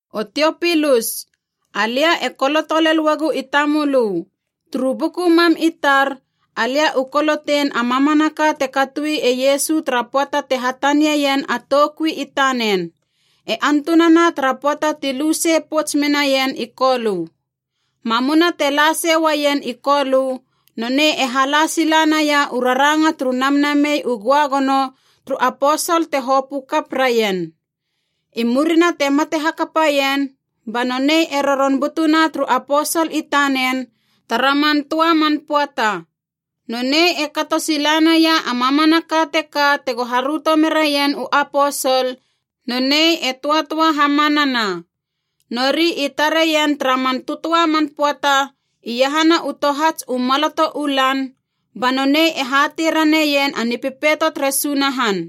O Tiopilus, alia e koloto lel uagu i tamölö. Turu buku mam i tar alia u kolotein a mamanaka te katoi e Iesu tara pöata te hatanieien a toukui i tanen, e antunana tara pöata ti lu sei pouts menaien i Kolö. Mamuna te la sei uaien i Kolö, nonei e hala sila naia u raranga turu Namnamei u Göagono turu aposol te hopö kap raien. I murina te mate hakapaien, ba nonei e roron butuna turu aposol i tanen tara man töa man pöata. Nonei e kato sila naia a mamanaka teka tego haröto meraien u aposol, nonei e töatöa hamanana. Nori i tareien tara man tötöa man pöata iahana u tohats u maloto u lan, ba nonei e hatei raneien a Nipepeito tere Sunahan.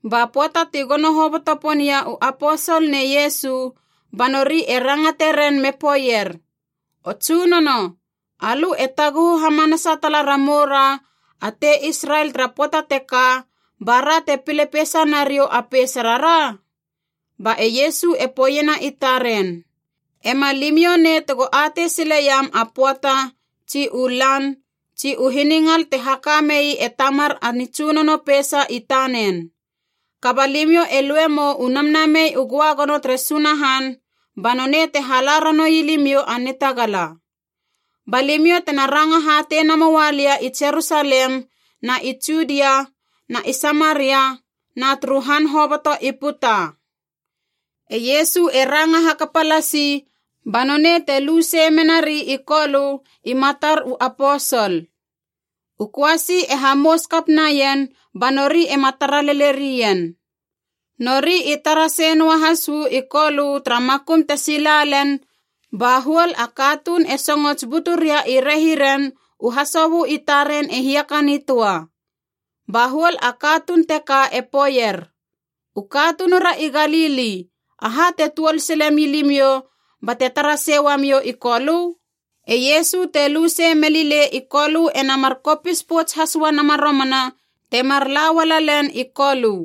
Ba pöata ti gono hoboto pon ia u aposol ne Iesu ba nori e rangate ren me poeier, “O Tsunono, Alö e taguhu hamanasa tala ramoura a tei Israel tara pöata teka bara te pile peisa nariou a peisarara?” Ba e Iesu e poeiena i taren, “Ema limiou nei tego atei sileiam a pöata tsi u lan tsi u hiningal te haka mei e Tamar a nitsunono peisa i tanen. Kaba limiou e luemou u Namnamei u Göagono tere Sunahan ba nonei te hala ranoui limiou a nitagala. Ba limiou tena ranga hatei namoua lia i Jerusalem na i Judia na i Samaria na turu han hoboto i puta.” E Iesu e ranga hakapa lasi ba nonei te lu sei menari i kolö i matar u aposol. U köasi e hamous kap naien ba nori ema tara lele rien. Nori i tara sei noa has uu i kolö tara makum te sila len, ba huol a katuun e songots butu ria i rehiren, u hasobö i taren e hiaka nitöa. Ba huol a katuun teka e poeier, “U katunura i Galili, aha te tuol sile mi limiou bate tara sei uamiou i kolö? E Iesu te lu sei me lilei i Kolö ena mar kopis pouts has uanama romana temar la uala len i Kolö.”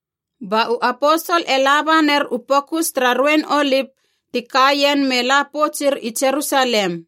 Ba u aposol e laban ner u Pokus tara Ruein Olip ti kaien me la poutsur i Jerusalem.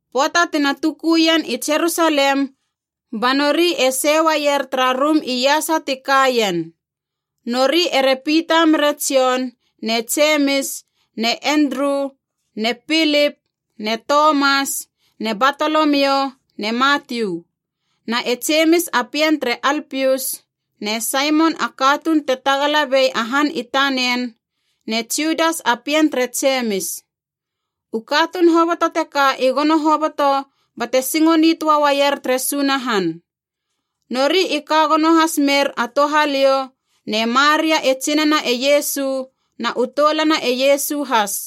Pöata tina tukuien i Jerusalem ba nori e sei uaier tara rum iasa ti kaien. Nori ere Pita mere Jon ne Jemis ne Endru, ne Pilip ne Tomas ne Batolomio ne Matiu. Na e Jemis a pien tere Alpius, ne Saimon a katuun te tagala bei a han i tanen, ne Judas a pien tere Jemis. U katuun hoboto teka i gono hoboto bate singo nitöa uaier tere Sunahan. Nori i ka gono has mer a touhaliou, ne Maria e tsinana e Iesu, na u toulana e Iesu has.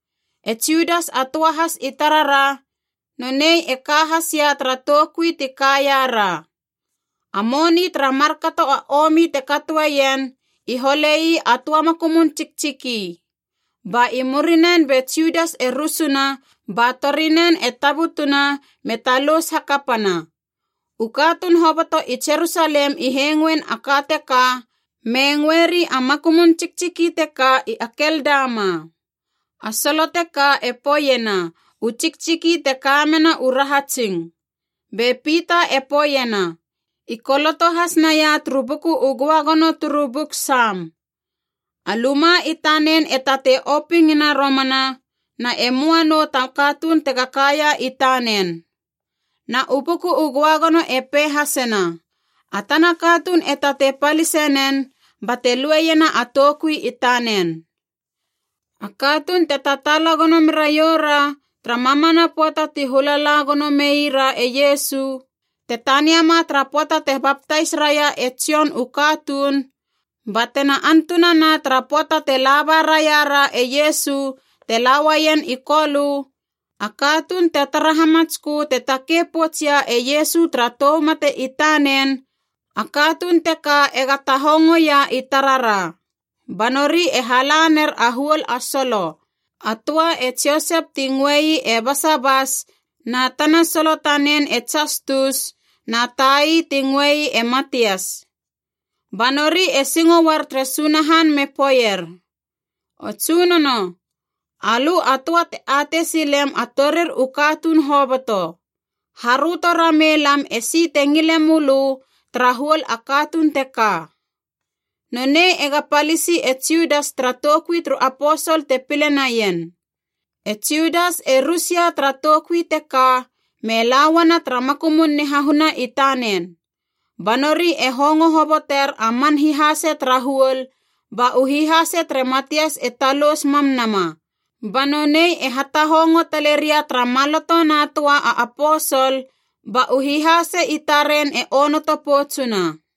E Judas a töa has i tarara, nonei e ka has ia tara toukui ti kaia ra.” A moni tara markato a omi te katoeien, i holei a töa makumun tsiktsiki. Ba I murinen be Judas e rusuna ba torinen e tabutuna me talous hakapana. U katuun hoboto i Jerusalem i hengoin a ka teka me ngöeri a makumun tsiktsiki teka i Akeldama. A solo teka e poeiena “U Tsiktsiki te kamena u Rahatsing.” Be Pita e poeiena, “I koloto has naia turu Buku u Göagono turu Buk Sam, ‘A luma i tanen e tatei opingina romana, na e möa nou ta katuun tega kaia i tanen.’ “Na u Buku u Göagono e pei hasena, ‘A tana katuun e tatei palise nen bate lueiena a toukui i tanen.’ “A katuun te tataala gono meraiou ra tara mamana pöata ti hula la gono mei ra e Iesu, te taniama tara pöata te baptais raia e Jon u katuun batena antunana tara pöata te laba raia ra e Iesu te lauaien i Kolö, a katuun te tara hamatskö te takei pouts ia e Iesu tara tou mate i tanen, a katuun teka ega tahongoia i tarara.” Ba nori e hala ner a huol a solo, a töa e Josep ti ngöei e Basabas na tana solo tanen e Jastus, na tai ti ngöei e Matias. Ba nori e singo uar tere Sunahan me poeier, “O Tsunono, alö a töa te atei silem a torir u katuun hoboto. Haröto ramei lam esi te ngile mölö tara huol a katuun teka. Nonei ega palisi e Judas tara toukui turu aposol te pile naien. E Judas e rus ia tara toukui teka me la uana tara makumun nihahuna i tanen.” Ba nori e hongo hoboter a man hihase tara huol, ba u hihase tere Matias e talous mam nama, ba nonei e hatahongo taleria tara maloto na töa a aposol ba u hihase i taren e onoto poutsuna.b